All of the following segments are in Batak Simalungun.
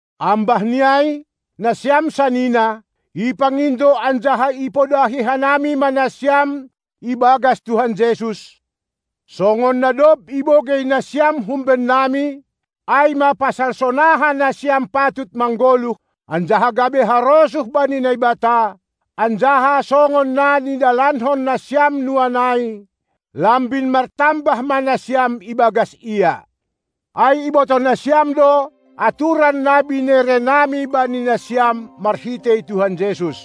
Ambah ni ai, nasiam sanina, ipangindo anjaha ipodahi hanami ma nasiam ibagas Tuhan Jesus; songon na dob ibogei nasiam humbennami, ai ma pasal sonaha nasiam patut manggoluh anjaha gabe harosuh bani Naibata, anjaha songon na nidalankon nasiam nuan ai, lambin martambah ma nasiam ibagas Ia. Ai ibotoh nasiam do aturan na binerenami bani nasiam marhitei Tuhan Jesus.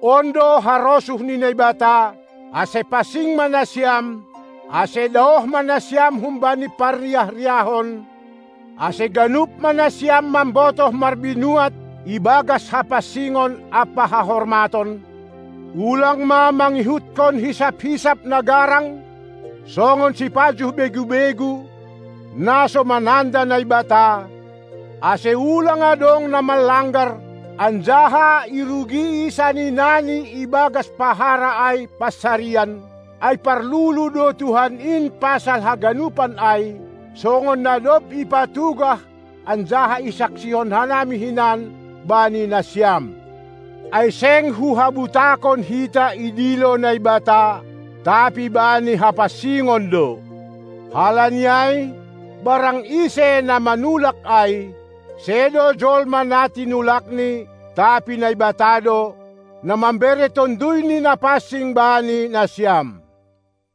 On do harosuh ni Naibata, ase pansing ma nasiam, ase daoh ma nasiam humbani parriah-riahon, ase ganup ma nasiam mambotoh marbinuat ibagas hapansingon ampa hahormaton, ulang ma mangihuthon hisap-hisap na garang, songon sipajuh begu-begu, na so mananda Naibata, ase ulang adong na manlanggar, anjaha irugii saninani ibagas pahara ai (pansarian), ai parlulu do Tuhan in pasal haganupan ai, songon na dob ipatugah anjaha isaksihon hanami hinan bani nasiam. Ai seng hu habutakon hita idilo Naibata, tapi bani hapansingon do. Halani ai, barang ise na manulak ai, sedo jolma na tinulakni, tapi Naibata do, na mambere TonduyNi Napansing bani nasiam.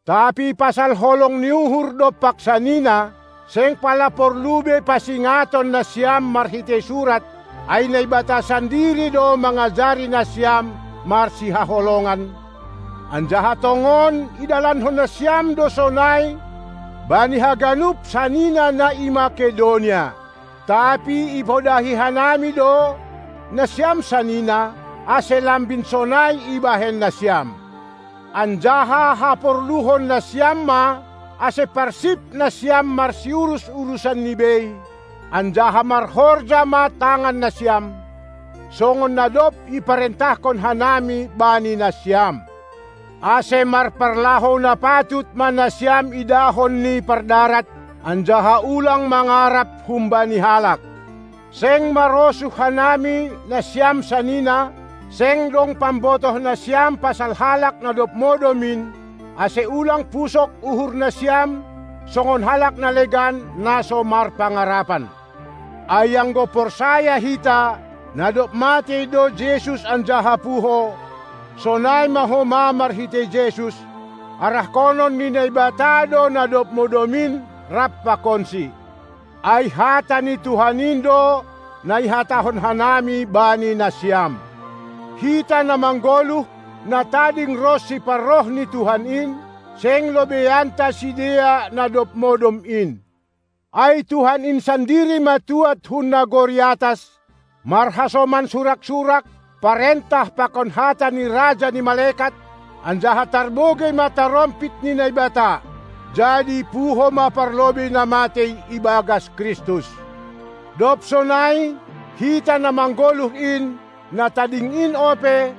Tapi pasal holong ni uhur dompak sanina, seng pala porlu be pasingaton nasiam marhitei surat, ai Naibata sandiri do mangajari nasiam marsihaholongan, anjaha tongon idalankon nasiam do sonai bani haganup sanina na i Makedonia. Tapi ipodahi hanami do, nasiam sanina, ase lambin sonai ibahen nasiam. Anjaha haporluhon nasiam ma ase parsip nasiam marsiurus urusanni bei anjaha marhorja ma tangan nasiam, songon na dob iparentahkon hanami bani nasiam. Ase marparlahou na patut ma nasiam idahon ni pardarat, anjaha ulang mangarap humbani halak. Seng marosuh hanami, nasiam sanina, seng dong pambotoh nasiam pasal halak na dob modom in, ase ulang pusok uhur nasiam songon halak na legan, na so marpangarapan. Ai anggo porsaya hita, na dob matei do Jesus anjaha puho, sonai ma homa marhitei Jesus, arahkonon ni Naibata do na dob modom in rap pakonSi. Ai hata ni Tuhan in do na ihatahon hanami bani nasiam: Hita, na manggoluh, na tading ronsi parroh ni Tuhan in, seng lobeianta sidea, na dob modom in. Ai Tuhan in sandiri ma tuad hun nagori atas marhasoman surak-surak, parentah pakon hata ni raja ni malekat, anjaha tarbogei ma tarompit ni Naibata. Jadi puho ma parlobei na matei ibagas Kristus. Dob sonai, hita na manggoluh in, na tading in ope,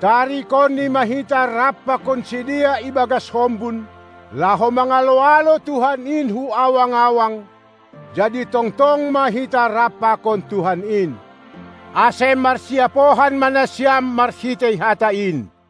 tarikonNi ma hita rap pakon sidea ibagas hombun, laho mangalo-alo Tuhan in hu awang-awang, jadi tongtong ma hita rap pakon Tuhan in. Ase marsiapohan ma nasiam marhitei hata in.